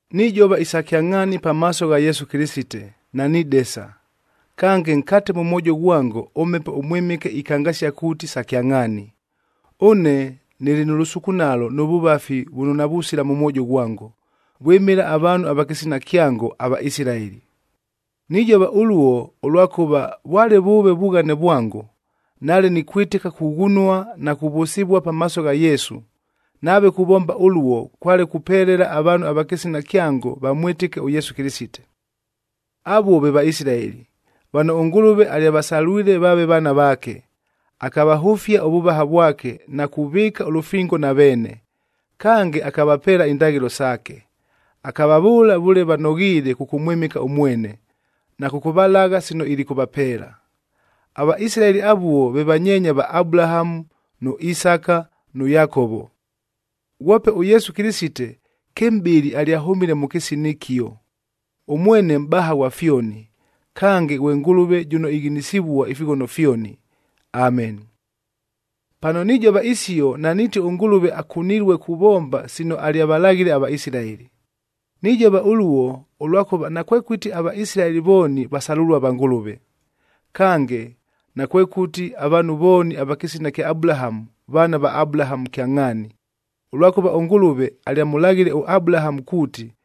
Nijova isa kyangʼhaani pamaaso gha Yesu Kɨlɨsite, nanidesa, kange nkate mʉ mwojo ghwango ʉMhepo ʉMwɨmɨke ikangasia kuuti sa kyangʼhaani. Ʉne nɨlɨ nʉ lʉsukunalo nʉ vʉvafi vʉno navusila mʉ mwojo ghwango, vwɨmɨla avaanhu ava kɨsina kyango, aVaisilaeli. Nijova ʉluo, ʉlwakʉva, vwale vʉʉve vughane vwango, nale nikwɨtɨka kughunua na kuvʉsɨvua pamaaso gha Yesu, nave kuvomba ʉluo kwale kupelela avaanhu va kɨsina kyango vamwɨtɨke ʉYesu Kɨlɨsite. Avuo ve Vaisilaeli, vano ʉNgʉlʉve alyavasalwile vaave vaana vaake, akavahʉfia ʉvʉvaha vwake na kuvɨɨka ʉlʉfingo na veene. Kange, akavapeela indaghɨlo saake, akavavʉʉla vʉle vanoghiile kʉkʉmwɨmɨka ʉmwene, na kʉkʉvalagha sino ilikʉvapeela. AVaisilaeli avuo ve vanyeenya va Abulahamu, nʉ Isaka nʉ Yakovo. Ghwope ʉYesu Kɨlɨsite, kɨmʼbɨlɨ alyahʉmile mʉ kɨsina ɨkio. Ʉmwene mʼbaha ghwa fyoni, kange ghwe Ngʉlʉve jʉno ighinisivua ifighono fyoni! Ameni. Pano nijova isio, naniiti ʉNgʉlʉve akunilue kuvomba sino alyavalaghile aVaisilaeli. Nijova ʉluo, ʉlwakʉva nakwekʉti aVaisilaeli vooni vasalʉlua va Ngʉlʉve. Kange, nakwekʉti avaanhu vooni ava kɨsina kya Abulahamu, vaana va Abulahamu kyangʼhaani, ʉlwakʉva ʉNgʉlʉve alyamʉlaghile ʉAbulahamu kuuti,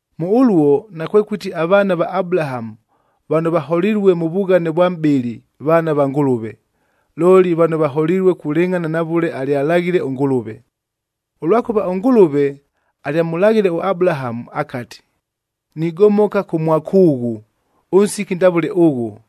Mʉ ʉluo nakwekʉti avaana va Abulahamu vano vaholilue mʉ vughane vwa mʼbɨlɨ vaana va Ngʉlʉve, looli vano vaholilue kulɨngʼhana na vʉle alyalaghile ʉNgʉlʉve. Ʉlwakʉva ʉNgʉlʉve alyamʉlaghile ʉAbulahamu akati, “Nigomoka kʉ mwakʉʉghʉ, ʉnsiki ndavʉle ʉghʉ,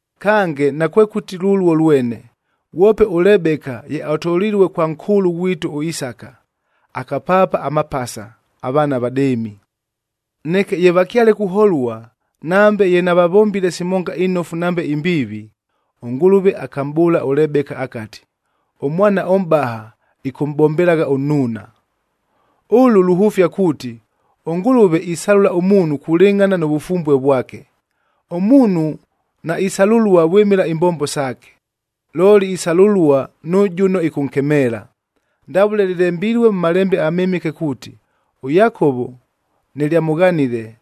Kange nakwekʉti lʉluo lwene, ghwope ʉLebeka ye atolilue kwa nkʉʉlʉ ghwitu ʉIsaka, akapaapa amapasa, avaana avadɨɨmi. Neke ye vakyale kuholua, nambe ye navavombile simonga inofu nambe imbiivi, ʉNgʉlʉve akamʼbʉʉla ʉLebeka akati, “Ʉmwana ʉmʼbaha ɨkʉmʼbombelagha ʉnnuuna.”c Ʉlʉ luhʉfia kuuti, ʉNgʉlʉve isalʉla ʉmuunhu kulɨngʼhana nʉ vʉfumbue vwake. Ʉmuunhu naisalʉlua vwɨmɨla imbombo saake, looli isalʉlua nʉ jʉno ɨkʉnkemeela. Ndavʉle lɨlembilue mʉ Malembe aMɨmɨke kuuti, “ɄYakovo nɨlyamʉghanile,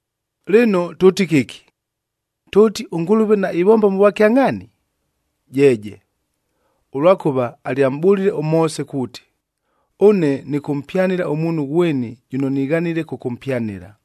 Lɨno tʉʉti kɨki? Tʉʉti, ʉNgʉlʉve naivomba mʉ vwakyangʼhaani? Jeeje, ʉlwakʉva alyamʼbʉlile ʉMoose kuuti, “Ʉne nɨkʉmpyanɨla ʉmuunhu ghweni jʉno nighanile kʉkʉmpyanɨla,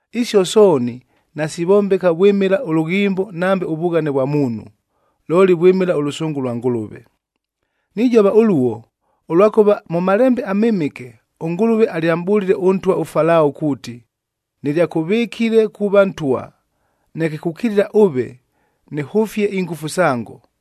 Isio sooni nasivombeka vwɨmɨla ʉlʉghimbo nambe ʉvughane vwa muunhu, looli vwɨmɨla ʉlʉsʉngʉ lwa Ngʉlʉve. Nijova ʉluo, ʉlwakʉva mʉ Malembe aMɨmɨke, ʉNgʉlʉve alyamʼbʉlile ʉntwa ʉFalao kuuti, “Nɨlyakʉvɨkile kuuva ntwa, neke kukilila ʉve, nɨhʉfie ingʉfu sango,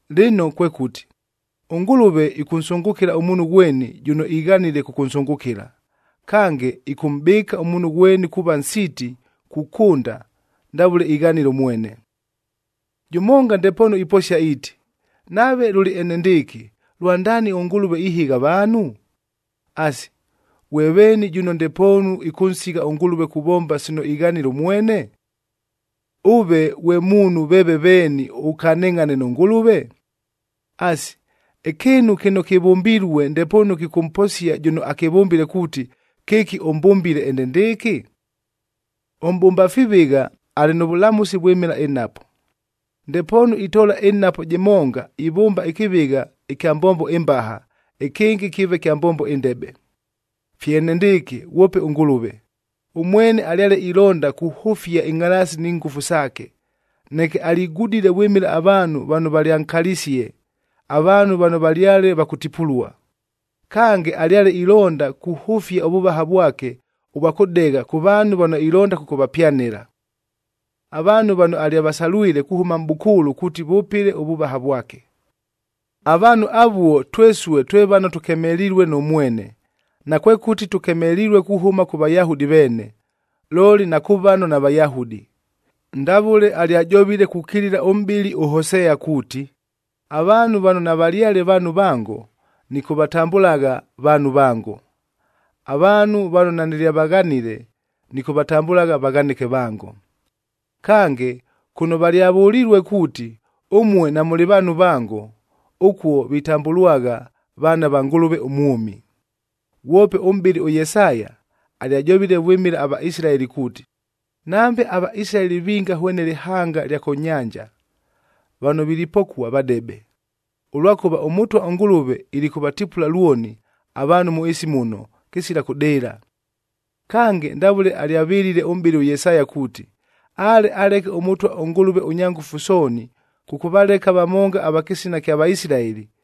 Lɨno kwekʉti, ʉNgʉlʉve ɨkʉnsʉngʉkɨla ʉmuunhu ghweni jʉno ighanile kʉkʉnsʉngʉkɨla, kange ɨkʉmʼbɨɨka ʉmuunhu ghweni kuuva nsiiti kukʉnda ndavʉle ighanile ʉmwene. Jʉmonga ndepoonu iposia iiti, “Nave lʉlɨ enendɨɨkɨ, lwandaani ʉNgʉlʉve ihɨgha avaanhu? Asi, ghwe veeni jʉno ndepoonu ɨkʉnsigha ʉNgʉlʉve kuvomba sino ighanile ʉmwene?” Ʉve ghwe muunhu veeve veeni ʉkanɨngʼhane nʉ Ngʉlʉve? Asi, ɨkɨɨnu kɨno kɨvʉmbilue ndepoonu kɨkʉmposia jʉno akɨvʉmbile kuuti, “Kɨki ʉmbʉmbile enendɨɨkɨ?” Ʉmʼbʉmba fivɨgha alɨ nʉ vʉlamʉsi vwɨmɨla ɨnhapo. Ndepoonu itoola ɨnhapo jɨmonga ivʉmba ɨkɨvɨgha ɨkya mbombo ɨmbaha, ɨkɨngɨ kɨɨve kya mbombo ɨndebe. Fye enendɨɨkɨ ghwope ʉNgʉlʉve. Ʉmwene alyale ilonda kuhʉfia ɨngʼhalaasi ni ngʉfu saake, neke aligudile vwɨmɨla avaanhu vano valyankalisie, avaanhu vano valyale va kʉtipulua. Kange, alyale ilonda kuhʉfia ʉvʉvaha vwake ʉvwa kʉdegha kʉ vaanhu vano ilonda kʉkʉvapyanɨla, avaanhu vano alyavasalwile kuhʉma mʼbʉkʉʉlʉ kuuti vʉpɨle ʉvʉvaha vwake. Avaanhu avuo twesue twe vano tʉkemelilue nʉ mwene, nakwekʉti tʉkemelilue kuhʉma kʉ Vayahudi veene, looli na kʉ vano naVayahudi. Ndavʉle alyajovile kukilila ʉmʼbɨli ʉHosea kuuti, “Avaanhu vano navalyale vaanhu vango, nɨkʉvatambʉlagha ‘vaanhu vango.’ Avaanhu vano nanɨlyavaghanile, nɨkʉvatambʉlagha ‘vaghanɨke vango.’” Kange, “Kʉno valyavʉlilue kuuti, ‘Ʉmue namʉlɨ vaanhu vango,’ ʉkuo vitambʉlwagha, ‘Vaana va Ngʉlʉve ʉmwʉmi.’” Ghwope ʉmʼbɨli ʉYesaya alyajovile vwɨmɨla aVaisilaeli kuuti, “Nambe aVaisilaeli vinga hwene lɨhanga ɨlya kʉ nyanja, vano vilipokua vadebe, ʉlwakʉva ʉMʉtwa ʉNgʉlʉve ilikʉvatipula lwoni avaanhu mʉ ɨɨsi muno, Kange, ndavʉle alyavɨlile ʉmʼbɨli ʉYesaya kuuti, “Ale aleke ʉMʉtwa ʉNgʉlʉve ʉNyangʉfu Sooni kʉkʉvaleka vamonga ava kɨsina kya Vaisilaeli,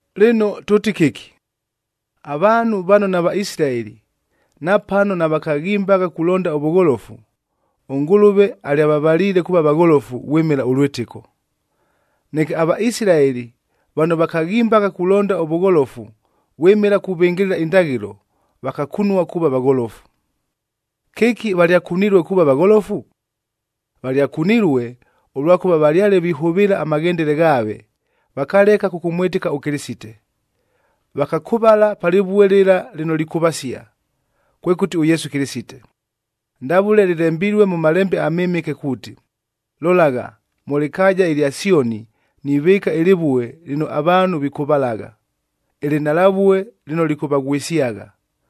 Lɨno tʉʉti kɨki? Avaanhu vano naVaisilaeli napano navakaghimbagha kulonda ʉvʉgholofu, ʉNgʉlʉve alyavavaliile kuuva vagholofu vwɨmɨla ʉlwɨtɨko. Neke aVaisilaeli vano vakaghimbagha kulonda ʉvʉgholofu vwɨmɨla kuvɨngɨlɨla indaghɨlo, vakakunua kuuva vagholofu. Kɨki valyakunilue kuuva vagholofu? Valyakunilue, ʉlwakʉva valyale vihʉvɨɨla amaghendele ghaave, vakaleka kʉkʉmwɨtɨka ʉKɨlɨsite. Vakakʉvala pa lɨvue lɨla lɨno likʉvasia, kwekʉti ʉYesu Kɨlɨsite. Ndavʉle lɨlembilue mʉ Malembe aMɨmɨke kuuti, “Lolagha, mʉ lɨkaaja ɨlya Syonii nivɨɨka ɨlɨvue lɨno avaanhu vikʉvalagha, ɨlɨnhalavue lɨno lɨkʉvaghwɨsyagha.